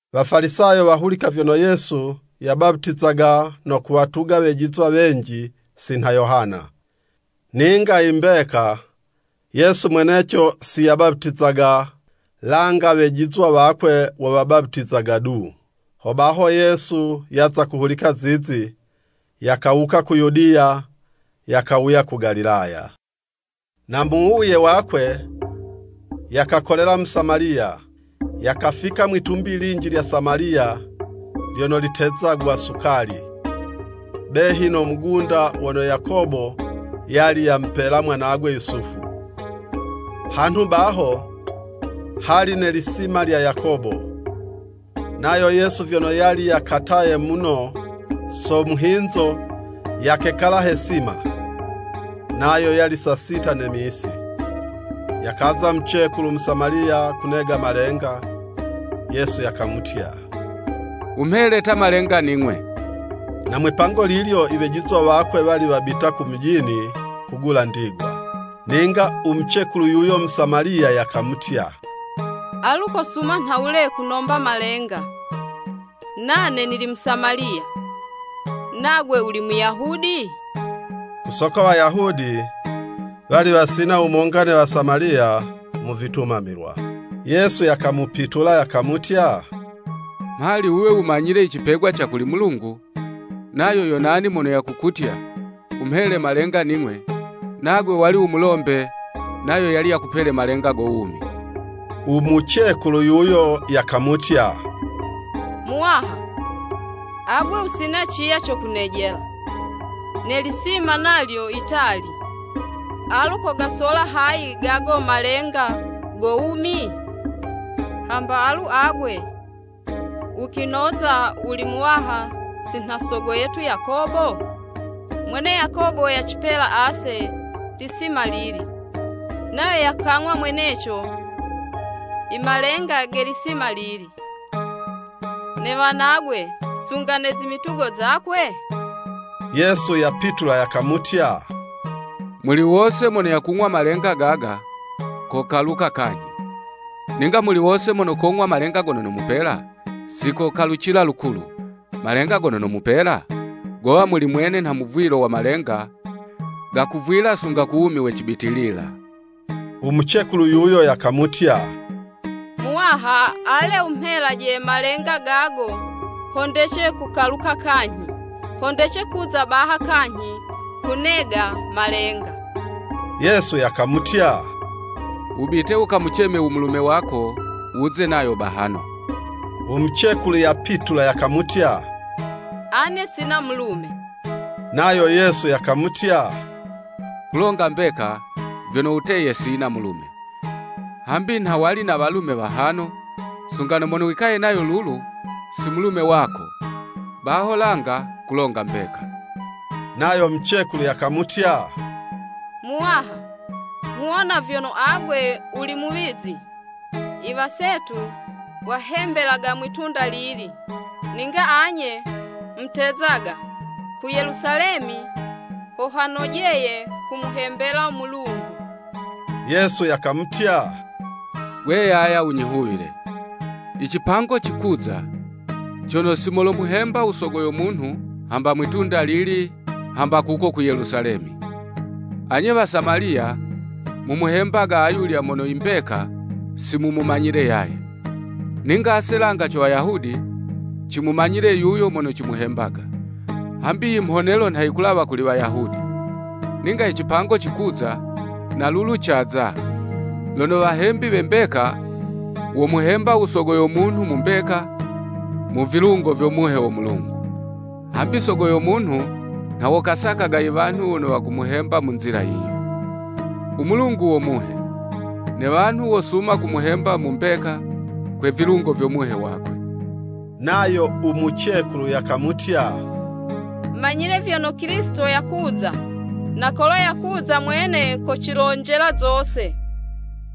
Wafalisayo wahulika vyono Yesu yabaputizaga no kuwatuga wejizwa wenji si nha Yohana. ( Ninga i mbeka, Yesu mweneco si yabaputizaga, langa wejizwa wakwe wo wabaputizaga du.) Hobaho Yesu yaza kuhulika zizi, yakawuka ku Yudiya, yakawuya ku Galilaya. Na mu wuwuye wakwe, yakakolela mu Samaliya. Yakafika mwitumbi linji lya Samaliya lyono litezagwa Sukali, behi no mugunda wono Yakobo yali yamupela mwanagwe Yusufu. Hanhu baho, hali ne lisima lya Yakobo. Nayo Yesu vyono yali yakataye muno so muhinzo, yakekala he 'sima. Nayo yali saa sita ne misi. Yakaza mucekulu Musamaliya kunega malenga, Yesu yakamutya, “Wumhele ta malenga ning'we.” (Na mwipango lilyo i wejizwa wakwe wali wabita ku mujini kugula ndigwa.) Ninga u mucekulu yuyo Musamaliya, yakamutya, “Alu kosuma nhawule kunomba malenga, nane nili Musamaliya, nagwe wuli Muyahudi?” (Ku soko Wayahudi wali wasina wumonga ne Wasamaliya, mu vitumamilwa.) Yesu yakamupitula yakamutya, “Mhali wuwe wumanyile i cipegwa ca kuli Mulungu, nayo yo nani mono yakukutya, wumhele malenga ning'we, nagwe wali wumulombe, nayo yali yakupele malenga go wumi.” U mucekulu yuyo, yakamutya, “Muwaha, agwe wusina ciya co kunejela, ne lisima nalyo yitali, alu kogasola hayi gago malenga go wumi? Hamba alu agwe, wukwinoza wuli muwaha si nho Sogo yetu Yakobo? Mwene Yakobo yacipela ase lisima lili, nayo yakang'wa mweneco i malenga ge lisima lili, ne wanagwe, sunga ne zimitugo zakwe?” Yesu yapitula yakamutya, “Muli wose mono yakung'wa malenga gaga, kokaluka kanyhi. Ninga muli wose mono kong'wa malenga gono nomupela, si kokalucila lukulu. Malenga gono nomupela gowa muli mwene nha muvwilo wa malenga, gakuvwila sunga ku wumi we cibitilila.” U mucekulu yuyo yakamutya, “Muwaha, ale wumhele malenga gago ho ndece kukaluka kanyhi, ho ndece kuza baha kanyhi kunega malenga.” Yesu yakamutya, “Wubite wukamuceme u mulume wako wuze nayo bahano.” U mucekulu yapitula yakamutya, “Ane sina mulume.” Nayo Yesu yakamutya, “Kulonga mbeka, vyono wuteye sina mulume. Hambi nha wali na walume wahano, sunga na mono wikaye nayo lulu, si mulume wako, baho langa kulonga mbeka.” Nayo mucekulu yakamutya, “Muwaha, nghuwona vyono agwe wuli muwizi. I wasetu wahembelaga mwitunda lili, ninga anye mutezaga, ku Yelusalemi ho hanojeye kumuhembela Mulungu.” Yesu yakamutya, “Gwe yaya wunyihuwile, icipango cikuza, cono si molomuhemba u Sogo yo munhu, hamba mwi'tunda lili, kuko ku Yelusalemi. Anye Wasamaliya, mumuhembaga ayulya mono imbeka, si mumumanyile yaye. Ninga ase langa co Wayahudi, cimumanyile yuyo mono cimuhembaga. Hambi i mhonelo nha yikulawa kuli Wayahudi. Ninga i cipango cikuza, na lulu caza, lono wahembi we mbeka, womuhemba u Sogo yo munhu mu mbeka, mu vilungo vyo Muhe wo Mulungu. Hambi Sogo yo Munhu nha wo kasakaga i wanhu wono wakumuhemba mu nzila yiyo. U Mulungu wo Muhe, ne wanhu wosuma kumuhemba mu mbeka, kwe vilungo vyo Muhe wakwe.” Nayo u mucekulu yakamutya, “Manyile vyono Kilisito yakuza, na kolo yakuza mwene, kocilonjela zose.”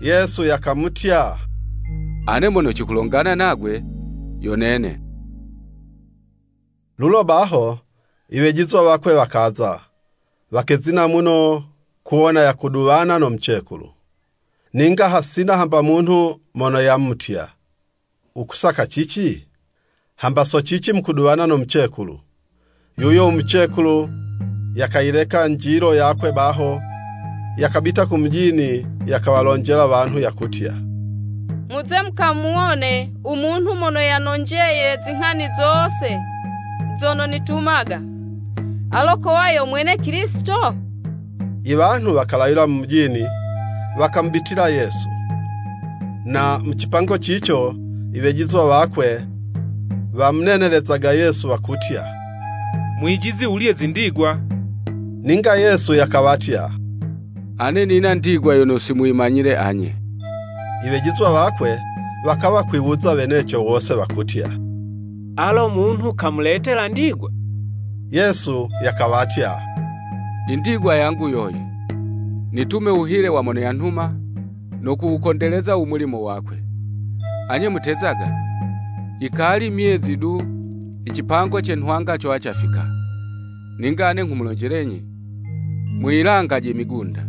Yesu yakamutya, “Ane mono cikulongana nagwe, yo Nene.” Lulo baho i wejizwa wakwe wakaza, wakezina muno kuwona yakuduwana no mucekulu. Ninga hasina hamba munhu mono yamutya, “Wukusaka cici?” Hamba, “So cici mukuduwana no mucekulu.” Yuyo mucekulu yakayileka njilo yakwe baho, yakabita ku mujini, yakawalonjela wanhu yakutya, “Muze mukamuwone u munhu mono yanonjeye zinghani zose zono nitumaga, alo kowa yo mwene Kilisito?” I wanhu wakalawila mu mujini, wakamubitila Yesu. Na mu cipango cico, i wejizwa wakwe wamunenelezaga Yesu, wakutya, “Mwijizi wulye zindigwa.” Ninga Yesu yakawatya, “Ane nina ndigwa yono si muyimanyile anye.” I wejizwa wakwe wakawa kwiwuza weneco wose wakutya, “Alo munhu kamuletela ndigwa?” Yesu yakawatya, “I ndigwa yangu yoyi, nitume wuhile wa mono yanhuma, no kuwukondeleza u mulimo wakwe. Anye mutezaga, Yikali myezi du, i cipango cen hwanga cowa cafika. Ninga ane nghumulonjelenyi, muyilangaje migunda,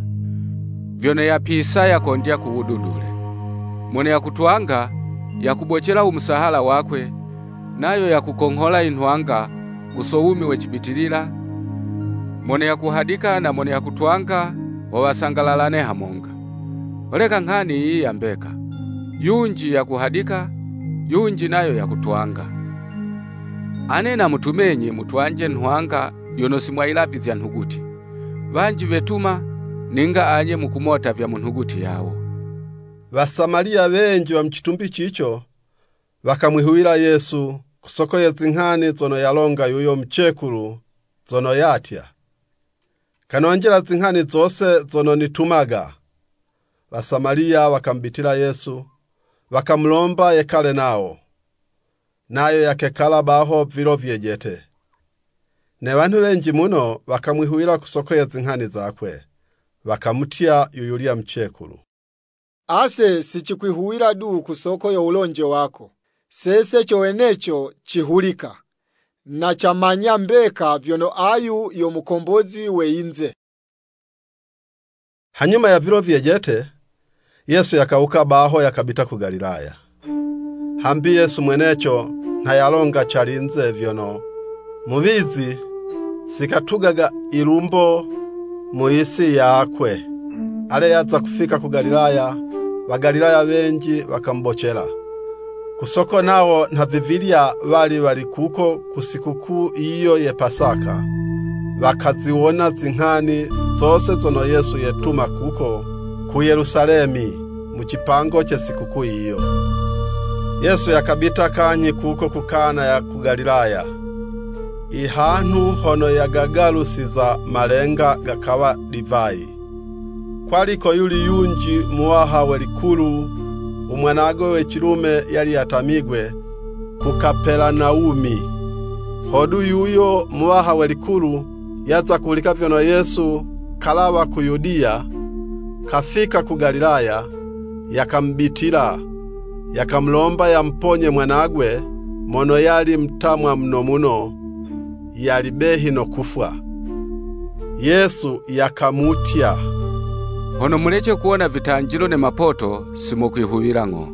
vyono yapisa, yakondya ku wududule. Mono yakutwanga, yakubocela u musahala wakwe, nayo yakukonghola i nhwanga, ku soko yo wumi we cibitilila, mono yakuhadika na mono yakutwanga, ho wasangalalane hamonga. Holeka nghani yiyi ya mbeka, ‘Yunji yakuhadika, yunji nayo yakutwanga.’ Ane namutumenyi, mutwanje nhwanga yono si mwayilavizya nhuguti, wanji wetuma, ninga anye mukumota vya munhuguti yawo.” Wasamaliya wenji wa mu citumbi cico, wakamwihuwila Yesu soko ye zinghani zono yalonga yuyo mucekulu, zono yatya, “Kanonjela zinghani zose zono nitumaga.” Wasamaliya wakamubitila Yesu, wakamulomba yekale nawo. Nayo yakekala baho vilo vyejete. Ne wanhu wenji muno wakamwihuwila ku soko ye zinghani zakwe. Wakamutya, yuyulya mucekulu, “Ase si cikwihuwila du ku soko yo wulonje wako, sese co weneco cihulika, na camanya mbeka vyono ayu yo Mukombozi we yinze.” Hanyuma ya vilo vyejete, Yesu yakawuka baho, yakabita ku Galilaya. Hambi Yesu mweneco nha yalonga calinze, vyono, “Muwizi si katugaga lilumbo mu yisi yakwe.” Ale, yaza kufika ku Galilaya, Wagalilaya wenji wakamubocela. Ku soko nawo nhavivilya, wali wali kuko ku sikukuu yiyo ye Pasaka, wakaziwona zinghani zose zono Yesu yetuma kuko ku Yelusalemi, mu cipango ce sikukuu yiyo. Yesu yakabita kanyhi kuko ku Kana ya ku Galilaya, i hanhu hono yagagalusiza malenga gakawa divayi. Kwali ko yuli yunji muwaha we likulu, u mwanagwe we cilume yali yatamigwe ku Kapelanawumi. Hodu, yuyo muwaha we likulu, yaza kuhulika vyono Yesu kalawa ku Yudiya, kafika ku Galilaya, yakamubitila, yakamulomba yamuponye mwanagwe mono yali mutamwa muno muno, yali behi no kufwa. Yesu yakamutya, “Hono mulece kuwona vitanjilo ne mapoto, si mokwihuwila ng'o.”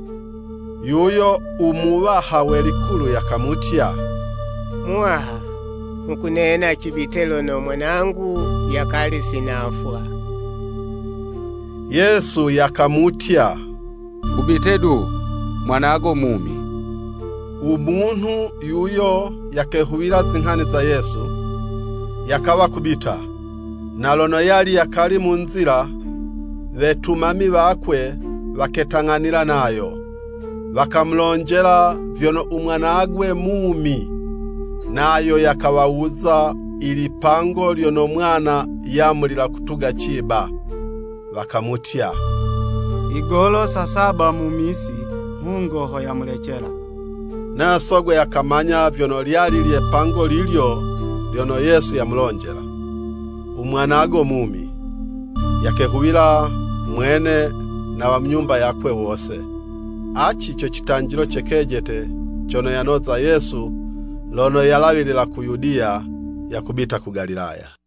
Yuyo u muwaha we likulu yakamutya, “Muwaha, nghukunena cibite lono mwanangu yakali si nafwa.” Yesu yakamutya, “Wubite du, mwanago mumi.” U munhu yuyo yakehuwila zinghani za Yesu, yakawa kubita. Na lono yali yakali mu nzila, wetumami wakwe waketang'anila nayo, wakamulonjela vyono u mwanagwe mumi. Nayo yakawawuza ilipango lyono mwana yamulila kutuga ciba. Wakamutya, “Yigolo saa saba mu misi, mhungo ho yamulecela.” Nayo sogwe yakamanya vyono lyali lye 'pango lilyo lyono Yesu yamulonjela, “U mwanago mumi.” Yakehuwila mwene, na wa mu nyumba yakwe wose. Aci co citanjilo ce kejete, cono yanoza Yesu lono yalawila ku Yudiya yakubita ku Galilaya.